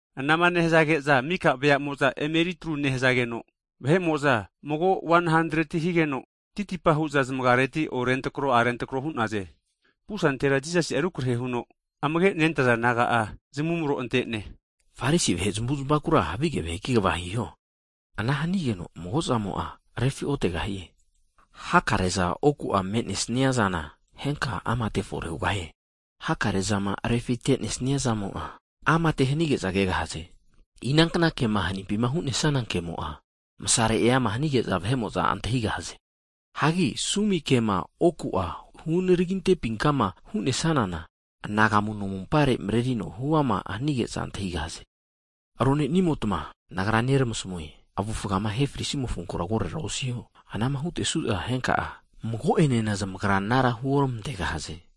Anama nehazage'za mika veamo'za emeritru nehazageno, rama'a tauseni'a vahe'mo'za titipa hu'za zamagiareti orentrako arentrako hu'naze. Pusantera Jisasi'a rukrahe huno, amage' nentaza disaipol naga'a zamavumro ante'ne, Farisi vahe zamuzmakura havige vaheki kva hiho. Na'ankure mago'zamo'a refiotegahie. Hakare'za oku'a me'nesnia zana, henka'a amate fore hugahie. Hakare zama refitenesnia zamo'a, amate efore hanige'za kegahaze. Inankna kema hanimpima hu'nesana kemo'a, masare eama hanige'za vahe'mo'za antahigahaze. Hagi sumike'ma oku'a hunaraginte'pinkama hu'nesanana, anagamu nomumpare marerino huama hanige'za antahigahaze. Rone'nimotma, Nagra neramasamue, avufgama ahe frisimofonkura korera osiho. Anama hutesu'za henka'a, mago'enena zamagra anara huoramantegahaze.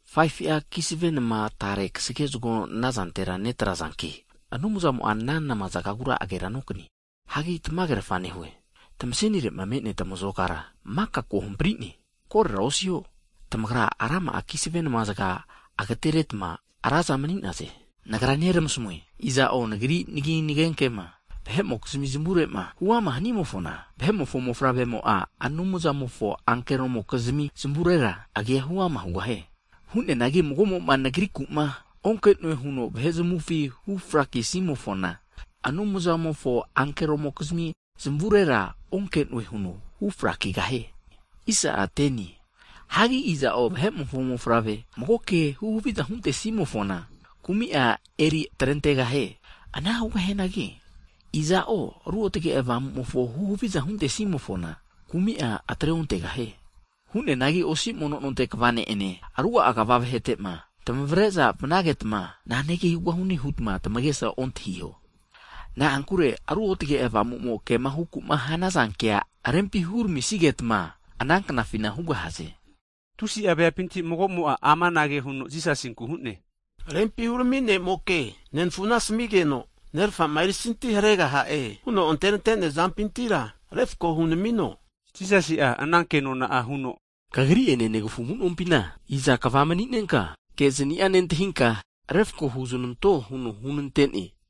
Hagi 5'a kisave nama tare kasage zagore netraze. Ana nehazankino Anumzamo'a ana namazagagura agera nokanie. Hagi tamagerafa nehue, tamasenire'ma me'nea tamazokara maka kohampari'ne. Korera osiho! Tamagara rama'a kisave namazaga agateretma ra'za mani'naze. Nagra neramasamue, iza'o Nagri nagi nagenkema vahe'mokizmi zmavurema huama hanimofona, Vahe'mofo Mofavremo'a, Anumzamofo ankeromo'kizimi zamurera agi'a huama hugahie. Hu'neanagi mago'mo'ma Nagriku'ma onke'noe huno vahe zamufi hufrakisi'mofona, Anumzamofo ankeromokizmi zamavurera Nagranena, zamagrira ozamage'noe hu'na hu frakizmantegahue. Hagi iza'o Vahe'mofo Mofavre mago kema huhaviza huntesimofona, kumi'a eri atrentegahie. Ana hugahianagi iza'o Ruotage Avamumofo huhaviza huntesimofona, kumi'a atreontegahie. Hu'neanagi, osi mono nonte kva vahete'ene, ruga'a kva vahetema tamavre'za vanageta, nanege hugahune hutma tamagesa ontahiho. Na'ankure Ruotage Avamumo kema huku'ma hanaza kea rempi huramisigetma ana knafina hugahaze. Tusi'a veapinti magomo'a amanage huno Jisasinku hu'ne, Rempi hurami nemoke, nenfuna asamigeno nerfama erisanti haregaha'e huno anterante'nea zampintira, refako hunamino. Jisasi'a ana kenona huno, Kagri'ene negafu amu'nompina, iza kva mani'nenka kezani'a nentahinka refko huzananto huno hunante'ne?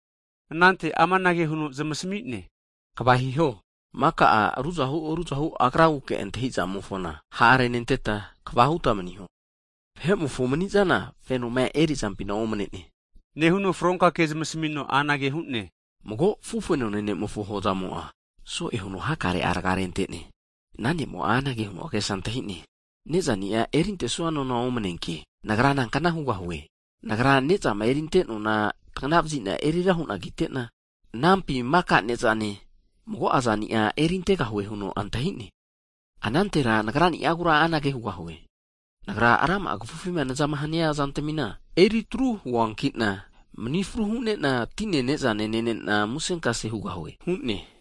Anante amanage huno zamasmi'ne, Kva hiho! Maka'a ruzahu ruzahu agraguke antahizamofona ha' renenteta, kva huta maniho, vahe'mofo mani'zana fenoma eri'zampina omnene. Nehuno fronka ke zamasmino anage hu'ne, Mago afufenone ne'mofo hozamo'a, so'eza huno hakare'a raga rentene. Ana ne'mo'a anage huno agesa antahi'ne, nezani'a erintesua nona omaneanki nagra nankna hugahue? Nagra ne'zama erinte nona tagna vazina erira huna kitena, anampi maka ne'zane, mago'a zani'a erintegahue huno antahi'ne. Anantera nagrani'agura anage hugahue, nagra rama'a kafufima nazama hania zantamina eritru huankina mani fru hu'nena tine nezane nenena musenkase hugahue hu'ne.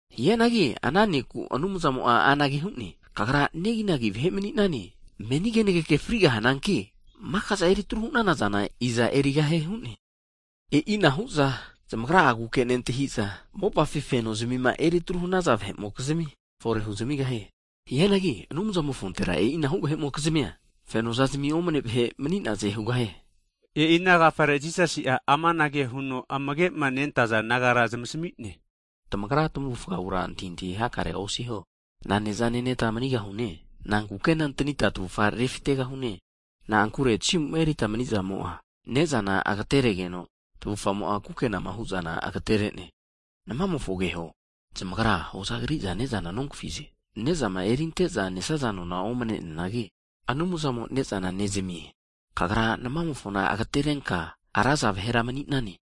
Hianagi ana ne'ku Anumzamo'a anage hu'ne, kagra neginagi vahe maninane! Meni kenageke frigahananki, maka'za eri atru hu'nanazana iza erigahie hu'ne? E'inahu'za zamagra'aguke nentahiza mopafi fenozmima eritru hanaza vahe'mokizmia fore huzamigahie. Hianagi Anumzamofontera e'inahu vahe'mokizmia fenozazmi omnene vahe mani'naze. E'i ana agafare Jisasi'a amanage huno amage'ma nentaza disaipol nagara zamasmi'ne. Tamagra tamavufagura antahintahi hakare osiho. Nane'za neneta manigahune, nankukena antanita tavufa refitegahune huta osiho. Na'ankure tasimuma erita manizamo'a ne'zana ageteregeno, tavufamo'a kukenama hu'zana agaterene. Namamofo keho, zamagra hoza kriza ne'zana nogafize. Nezama erinte'za nesaza nona omne'neanagi, Anumzamo ne'zana nezamie. Tamagra namamofona agatereta raza vahera mani'naze.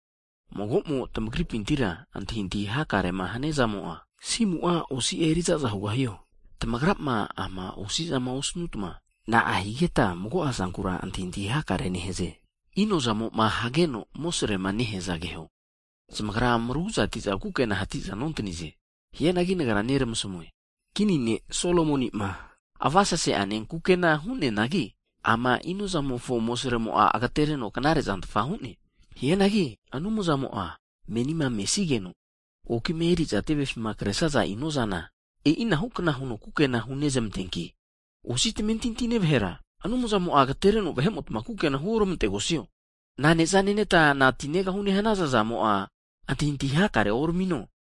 Mago'mo tamagripintira antahintahi hakarema haniazamo'a, asimu'a osi'a erizaza hugahio? Tamagrama ama osizama osanutma, na'a higeta mago'a zankura antahintahi hakare nehaze? Inozamo'ma hageno amosrema neheaza keho. Zamagra mragu'za atiza kukena hatiza nontanize. Hianagi Nagra neramasamue, kini ne' Solomoni'ma avasese'ane kukena hu'neanagi, ama flauamofo amosaremo agetereno knarezantfa hu'ne. Hianagi Anumzamo'a meni mesigeno okima eriza tevefima kresnaza inozana e'inahukna huno kukena hunezmanteanki, Osi tamentintine vahera! Anumzamo'a agetereno vahe'mota kukena huormantegosio? Naneza neneta, nanti negahune huta antahintahi hakarea osiho.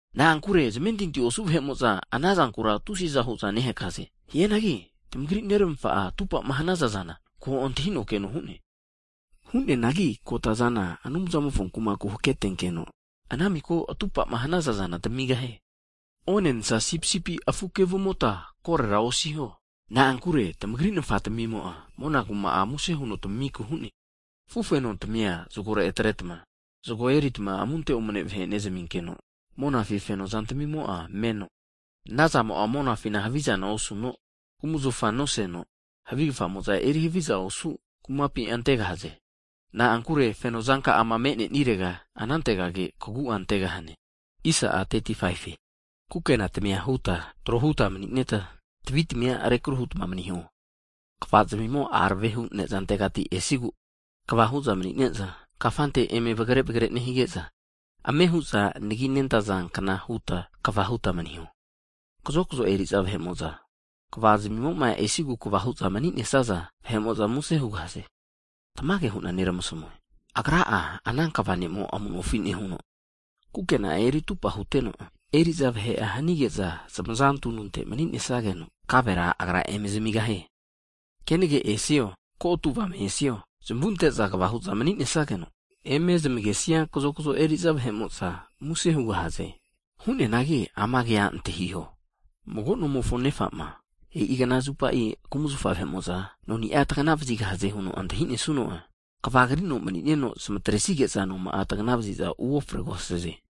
Na'ankure zamentinti osu vahe'mo'za anazankura tusi'za hu'za nehakaze. Hianagi tamagri, Neramafa'a atupama hanaza'zana ko antahino keno hu'ne. Hu'neanagi kotazana, Anumzamofo kumaku haketenkeno, ana miko atupama hanaza zana tamigahie. Onensa sipisipi afu kevumota korora osiho. Na'ankure tamagri Nafatmimo'a, mona kuma'a muse huno tamiku hu'ne. Afufenontamia zagore atretma, zago erita amunte omane vahe nezminkeno monafi fenozantamimo'a meno, anazamo'a monafina havizana nosanageno, kumzafa nosesageno, havi kafamo'za eri havizana osu kumapi antegahaze. Na'ankure feno zanka'ama me'nenirega, anantegage kagu'a antegahane. Hagi Kukena tamia huta, tro huta mani'neta, tavi tamia rekru hutma maniho. Kva'zmimo arave hu nezantegati esigu kva hu'za manine'za, kafante eme vagre vagre nehige'za, ame hu'za anagi nentazankna huta kva huta maniho. Hagi kazokzo eriza vahe'mo'za, kva zmimoma esigu kva hu'za mani'nesaza vahe'mo'za muse hugahaze. Tamage hu'na neramasamue, Agra'a ana kva nemo amu'nofi nehuno, kukena'a eri atupa huteno, eri'za vahe'a hanige'za zamaza tununte mani kaginesageno, kavera agra eme zamigahie. Kenege esio, kotu avame esio, zamunte'za kva hu'za maninesageno, eme zamagesia kazokzo eri'za vahe'mo'za, muse hugahaze. Hu'neanagi ama'nankea antahiho, mago nomofo nefama e'i knazupa kumzafa vahe'mo'za noni'a tagna vazigahaze huno antahinesuno'a, kvagrino mani'neno zamatresige'za noma'a tagna vaziza uofregahaze.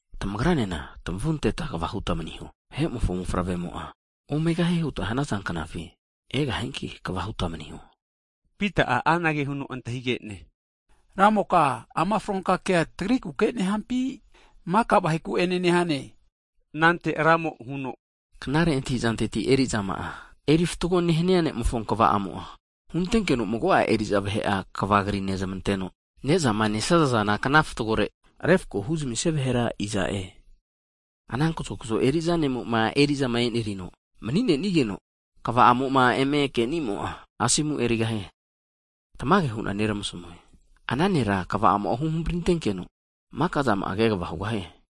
Tamagranena tamavu anteta kva huta maniho. Vahe'mofo Mofavremo'a, omegahie huta hanaza knafi, egahianki kva hutma maniho. Pita'a anage huno antahige'ne, Ramoka ama fronka kea tagrikuke nehampi, maka vaheku'ene nehane? Anante Ramo huno, Knare antahizanteti eri'zama'a erifatgo nehania ne'mofo kva'amo'a, huntenkeno mago'a eri'za vahe'a kva krinezmanteno, nezama nesaza zana kna fatgore refko huzamisia vahera iza'e? Ana kazokzo eriza ne'mo'ma eri'zama enerino mani'nenigeno, kva'amo'ma eme kenimo'a, asomu erigahie. Tamage hu'na neramasmue. Ana nera kva'amo'a huhamprintenkeno, maka zama'a kegava hugahie.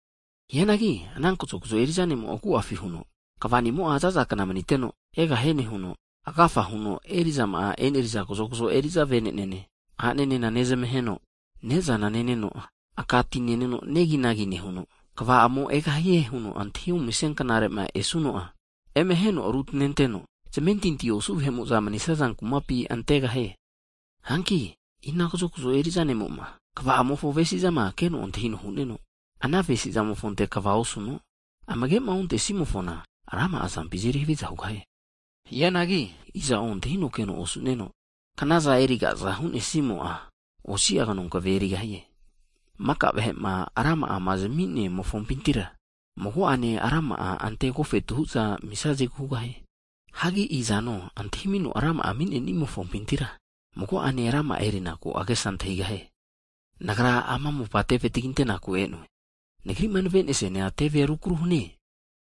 Hianagi ana kazokzo eri'za ne'mo'a agu'afina huno, kvanimo'a za'za kna maniteno egahie nehuno, agafa huno eri'zama eneriza kazokzo eri'za vene'nene, ananene nezmaheno, ne'zana neneno, aka ti neno neginagi nehuno, kva'amo egahie huno antahiominesia knare'ma esuno'a, eme aheno rutaneteno, zamentinti osu vahe'mo'za manisaza kumapi antegahie. Hanki ina kazokzo eriza ne'mo'ma, kva'amofo avesizama keno antahino hu'neno, ana avesimofonte kva osuno, amagema ontesimofona rama'a zampi azeri haviza hugahie. Hianagi iza'o antahino keno osu'neno, knaza erigaza hu'nesimo'a, osia knokeve erigahie. Maka vahe'ma rama'ama zminemofompintira, mago'ane rama'a ante agofetu hu'za amisazegu hugahie. Hagi izano antahimino rama'a ami'nenimofompintira, mago'ane rama'a erinaku agesa antahigahie. Nagra ama mopa teve taginteku e'noe. Nagri'ma navesiana tevea rukru hanie!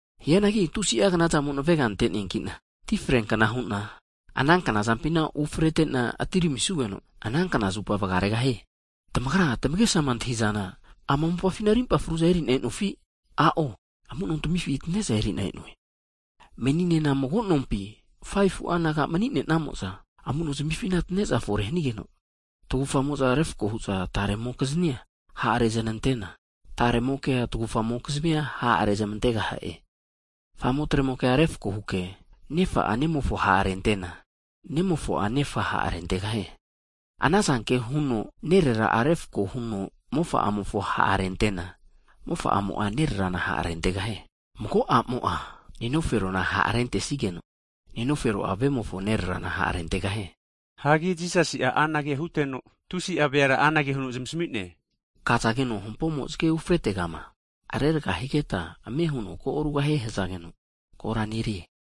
Hianagi tusi'a knazamo navega ante'neankina ti freankna hu'na, ana kanazampina ufretena atiramisugeno, ana knazupa vagaregahie! Tamagrama tamagesama antahi'zana, ama mopafina rimpa fru'za erina enofi? A'o, amu'nontamifina atane'za eri'na e'noe. Meninena mago nompi 5fu'a naga mani'nenamo'za amunozamifina atane'za fore hanigeno, tagufamo'za refko hu'za taremokiznia ha' reznantesageke, taremokea tagufamokizmia ha' rezmantegaha'e. Famo tremokea refko huke, nefa'a nemofo ha' rentena, nemofo'a nefa ha' rentegahie. Anazanke huno nerera'a refko huno mofa'amofo ha' rente'na, mofa'amo'a nererana ha rentegahie. Mago a'mo'a nenoferona ha' rentesigeno, nenofero'a, vemofo nererana ha' rentegahie. Hagi Jisasi'a anage huteno, tusi'a veara anage huno zamasami'ne, Kazageno hampomo zage ufretegama reraga higeta, ko arugahie nehazageno, kora nerie.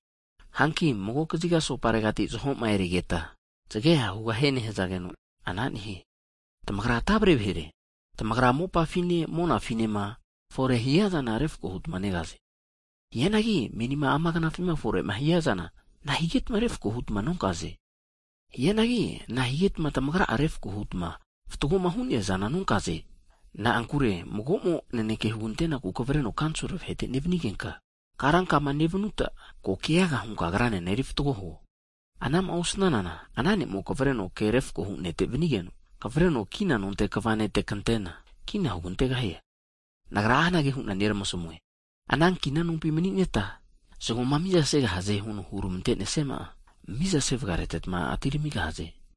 Hanki mago kaziga asoparegati (sauti) zahoma erigeta, zage ha hugahie nehazageno, ana nehie. Tamagra tavre vahere! Tamagra mopafine monafinema fore hiazana refko hutma negaze. Hianagi menima ama knafima fore'ma hiazana na'a higetma refko hutma nonkaze? Hagi nahigetma tamagra'a refko hutma fatgoma hu'neazana nonkaze? Na'ankure magomo naneke huganteku kavreno kanisol vahete nevanigenka, karankama nevanuta, ko keaga hunka agranena erifatgo huo. Ana'ma osnanana ana ne'mo'a kavreno ke refkohu nete vanigeno, kavreno kina nonte kva nete kantena, kina hugantegahie. Nagra anage hu'na neramasamue, ana kina nompi mani'neta, zagoma miza segahaze huno hurmantenesiama'a miza sevagareteta atiramigahaze.